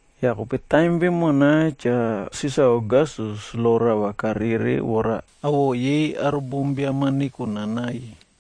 Yah kope taim vemona Cha Sisar Ogastus lo rava karere vora awoꞌo yei aro bombiam-a nekonanai.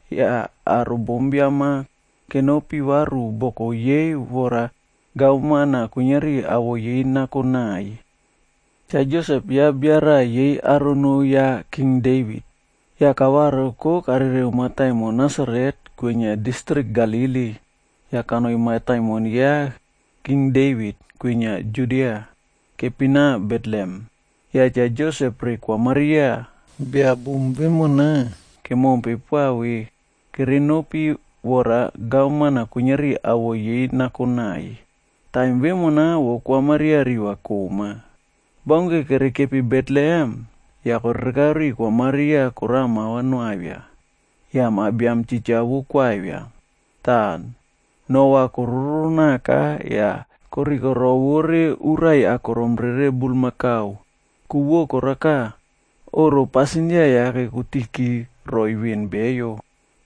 Yah aro bombiam koka kenopi varu boku yei vora gavman-a kuiniari awoꞌo yei nakonai. Cha Josep ya bia raꞌa yei aro noo ya King Devit. Yah kavariko karereu mataimon Nasaret kwinia distrik Galili, yah kanoi mataimon ya King Devit, kwinia Judia. Kepina Betlehem. Yah Cha Josep re Kwa Maria, bia bom vemona kemompe poa ve kerenopi vora gavman-a kuiniari awoꞌo yei nakonai. Taim vemona vo Kwa Maria riva koꞌma. Baunke kerekepi Betlehem, yah korereka riu Kwa Maria korao mava noavia. Yah ma biam titja vo koavia. Tah no va kororo naka yah korikorovore urai akorom rere bulmakau. Ku vo korao veka, oꞌro pasindia yake kotiki roiy veꞌen beyo.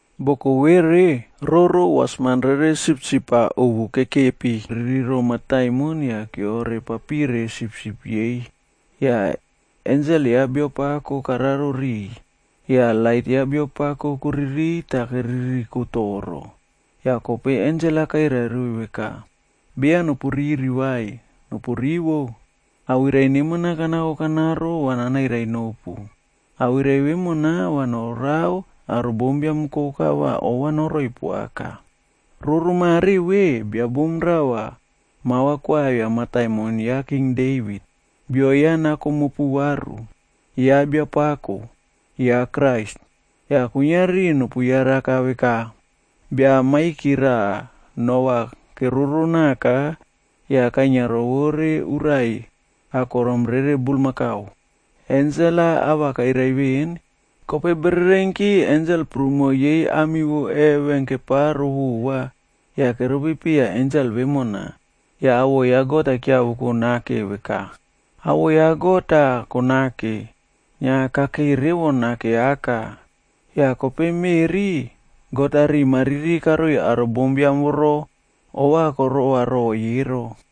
Boko vere, roro wasman rere sipsip-ab ovu kekepiririro mataimon yah roro keore papire sipsip yei. Yah ensel ya Biapako kararo riꞌiy, yah lait ya Biapako koririy tah keriri toro. Yah kope ensel-a kairai roiy veka, “Beya nopuriri vai. Nopurivo. Awirai neman-a kanako kanaro va nanairai nopu. Awirai vemona va norao aro bombiam koka va ova noroiy revo. Roro mare ve, bia bom raꞌa mava koavia mataimon ya Cha Devit. Bio ya nako mopu varu. Ya Biapako, Yah kuiniari nopu yaraka veka, bia maiki raꞌa no va keroro naka, yah kainia rovore urai akorom rere bulmakau.” Ensel-a ava kairai veꞌen, kope bererenki ensel prumo yei ami vo heven keparo vova yah keropi piya ensel vemona. Yah awoꞌo ya God-a keavoko nake veka, “Awoꞌo ya God-a nemawoko, kasave kakei revo nake aka. Yah kope meꞌri, God-a riꞌi mariri karoi aro bombiam voro ovakorova roiy ero.”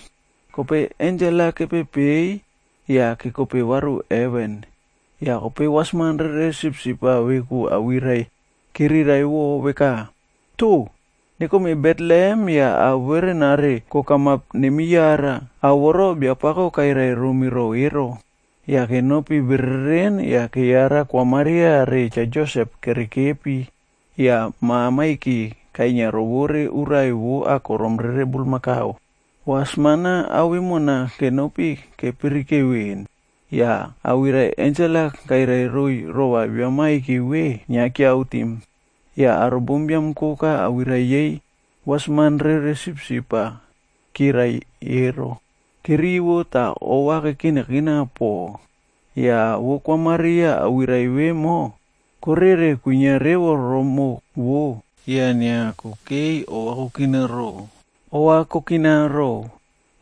Kope ensel-a kepepei yah kekope varu heven. Yah kope wasman rere sipsip-a veku awirai chiriraiꞌvo veka, “Toh! Nekome Betlehem yah ao verenare kokamap nemiyara. Ao voro Biapako kairai romi ro ero.” Yah kenopi bereren yah keyara Kwa Maria re Cha Josep kerekepi, yah ma maiki kainia rovore urai vo akorom rere bulmakau. Wasman-a ao vemona kepirike veꞌen, yah awirai ensel-a kairai roiy rova bia maiki ve, inia chiriraiꞌvo. Yah aro bombiam koka awirai yei wasman rere sipsip-a chirai ero, kerivo tah ova kekinakina pako. Yah vo Kwa Maria awirai koka vemona korere kwinia revo rimoꞌo vo, yah inia kokei ova kokina ro.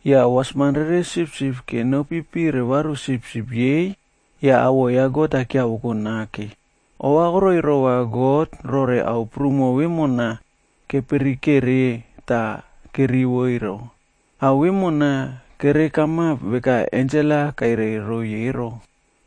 Yah wasman rere sipsip-a kenopipire varu sipsip yei yah awoꞌo ya God-a keavoko nake. Ovakoroi rova God rore ao prumo vemona kepirikere tah kerivo ero. Ao vemona kerekamap veka ensel-a kairai roiy ero.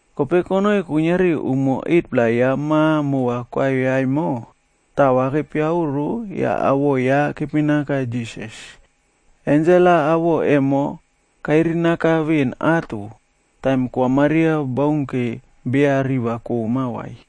Kope konoi kuiniari umo 8-pla ya ma mova koavia emo, taꞌa kepiaoro yah awoꞌo ya kepinaka Jisas. Ensel-a awoꞌo emo kairinaka veꞌen ato, taim Kwa Maria baunke beya riva koꞌma vai.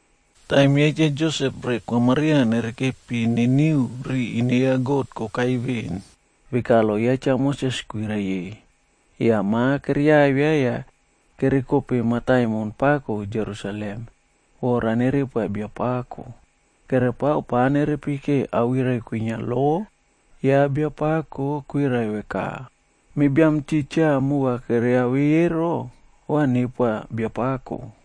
Taim ya Cha Josep re Kwa Maria nerekepi niniu ri ine ya God kokai veꞌen, veka lo ya Cha Moses kwirai ye. Yah mava keriavia yah kerekope Jerusalemd vora nerepoa Biapako. Kerepao pa nerepike awirai kwinia lo ya Biapako kwirai veka, “Me biam titja mova keyavei ero, va nepoa Biapako.”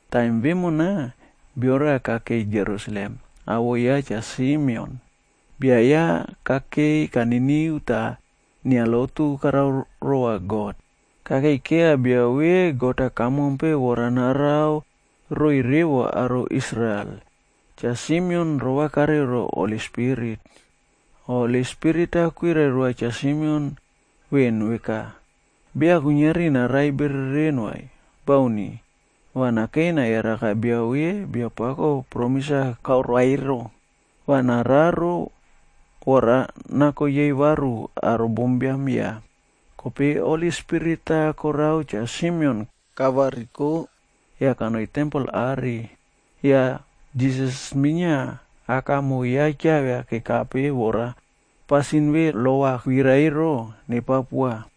Taim vemona, bio raꞌa kakei Jerusalem, awoꞌo ya Cha Simeon. Bia ya kakei kaniniu tah inia lotu karao rova God. Kakei keiya bia ve God-a kamompe vora narao roiy revo aro Israel. Cha Simeon rova kareu ro Holi Spirit. Holi Spirit-a kwirai roa Cha Simeon veꞌen veka, beya kuiniari narai bereren vai. Bauni. Va nakei nayaraka bia ve Biapako promis-a karoa ero, va nararo vora nako yei varu aro bombiam ya. Kope Holi Spirit-a korao Cha Simeon kavariko yah kanoi tempel are. Yah Jisas minia aka re moꞌo ya keavia kekape vora pasin ve lo va kwirai ero, nepao poa.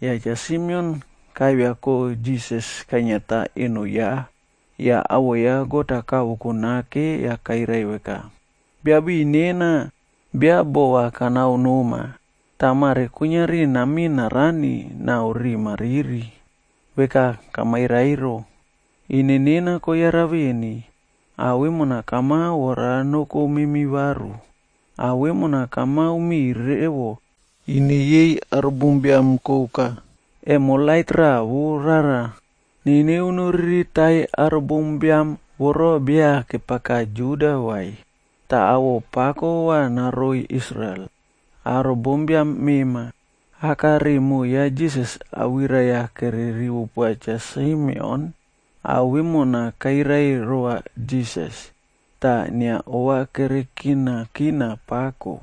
Yah Cha Simeon kaiviako Jisas kainiata eno ya, yah awoꞌo ya God-a kavoko nake yah kairai veka, “Biapako nena bia boꞌo va kanao noma, tah mare kuiniari namin narani yah riꞌi nena kuiniari nuinia toropo, veka kamairai ero. Ine nena koyara veni, ao vemona kamao vora noko memi varu. Ao vemona kamao miꞌiy revo ine yei aro bombiam koka. Emo lait raꞌa vo rara niniu noriritai aro bombiam voro beya keave Juda vai, tah awoꞌo pako va noroiy Israel, aro bombiam mema.” Aka re moꞌo ya Jisas awirai-a kererivo poa Cha Simeon ao vemo kairai rova Jisas, tah inia ova kerekinakina pako.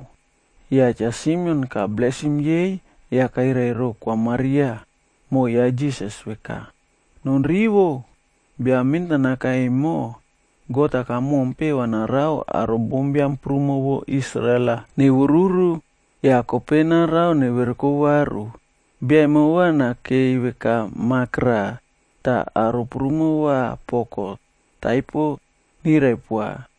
Yah Cha Simeon kablesim yei yah kairai ro Kwa Maria, moꞌo ya Jisas veka, “Non rivo! Bia mentanaka emo God-a kamompe va narao aro bombiam prumo vo Israel-a nevururu, yah kope narao neverekope varu. Bia emo va nakei veka mak raꞌa, tah aro prumo va poko taipo nirai poa.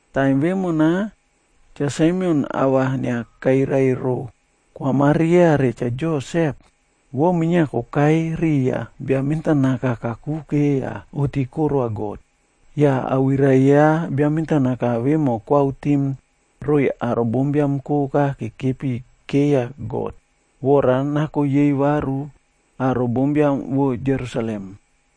Taim vemona Cha Simeon ava inia kairai ro Kwa Maria re Cha Josep, vo minia kokai riya bia mentanaka kakuke yah oꞌti koroa God. Yah awirai ya bia mentanaka vemo kairiraiꞌvo roiy aro bombiam koka kekepikeya God vora nako yei varu aro bombiam vo Jerusalem.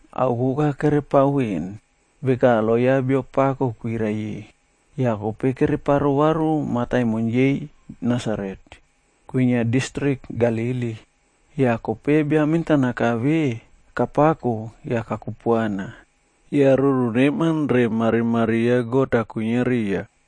Ao koka kerepao veꞌen, veka lo ya Biapako kwirai-e, yah kope kereparo varu mataimon yei Nasaret,f kwinia distrik Galili. Yah kope bia mentanaka ve kapako yah kakupuana. Yah ruru neman re marimari ya God-a kwinia riya.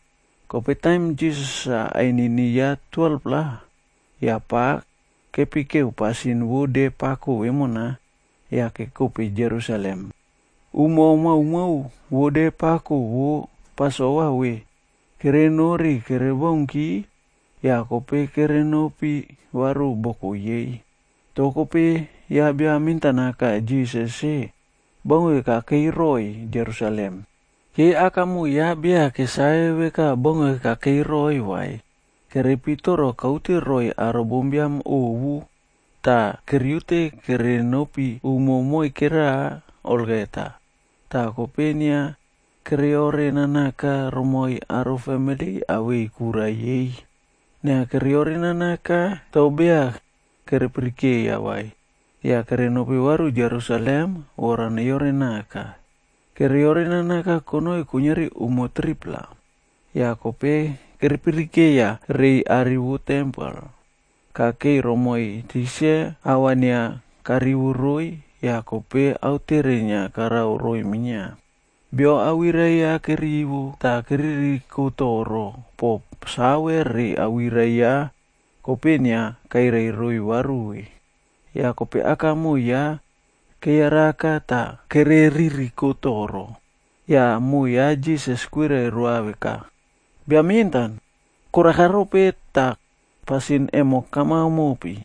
Kope taim Jisas-a ainini ya 12-pla, yah pa kepikeu pasin vo de pako vemona yah kekope Jerusalem. Umo maomao vo de pako vo Pasova ve kerenori kerebaunki, yah kope kerenopi varu boko yei. Toh kope ya bia mentanaka Jisas-e baunke kakeiroi Jerusalem. Yei aka re moꞌo ya beya kesave veka baunke kakeiroi vai. Kerepitoro kaute roiy aro bombiam ovu, tah keriute kerenopi umo moikera konoi naiy. Yah kope inia keyorenanaka romoiy aro famili awei kura yei. Inia kereore nanaka toh beya kerepirikeiya vai. Yah kerenopi varu Jerusalem vora neyorenaka. Keyorenanaka konoi kuiniari umo 3-pla, yah kope kerepirikeiya tempel are. Kakei romoiy tikse, ava inia karivo roiy yah kope autere inia karao roiy minia. Beyo awirai ya kerivo, tah keririko toro po save re awirai ya kope inia kairai roiy varu ve. Yah kope akamoꞌo ya kereyaraka tah kere ririko toro. Yah moꞌo ya Jisas kwirai roa veka, “Bia mentan, koraka rope tah pasin emo kamao mopi?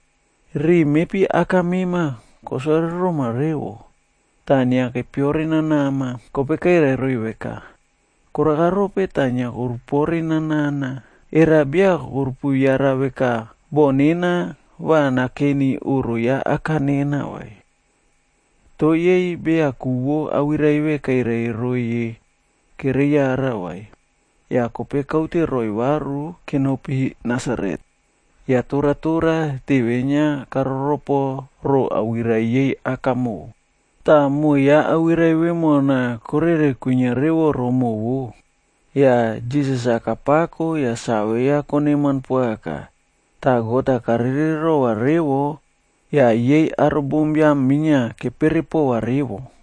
Riꞌi mepi aka mema kosore roma revo, tah inia kepiore nanama.” Kope kairai roiy veka, “Koraka rope tah inia korupore nana? Era beya korupu yara veka boh nena va nakeni oꞌro ya aka nena vai?” Toh yei beya ku vo awirai ve kairai roiy ye kereyara vai. Yah kope kaute roiy varu kenopi Nasaret. Yah toratora teve inia karoropo ro awirai yei akamoꞌo. Tah moꞌo ya awirai vemona korere kwinia revo romoꞌo vo. Yah Jisas-a kapako yah save ya koneman poaka. Tah God-a karere rova revo yah yei aro bombiam minia kepere pova revo.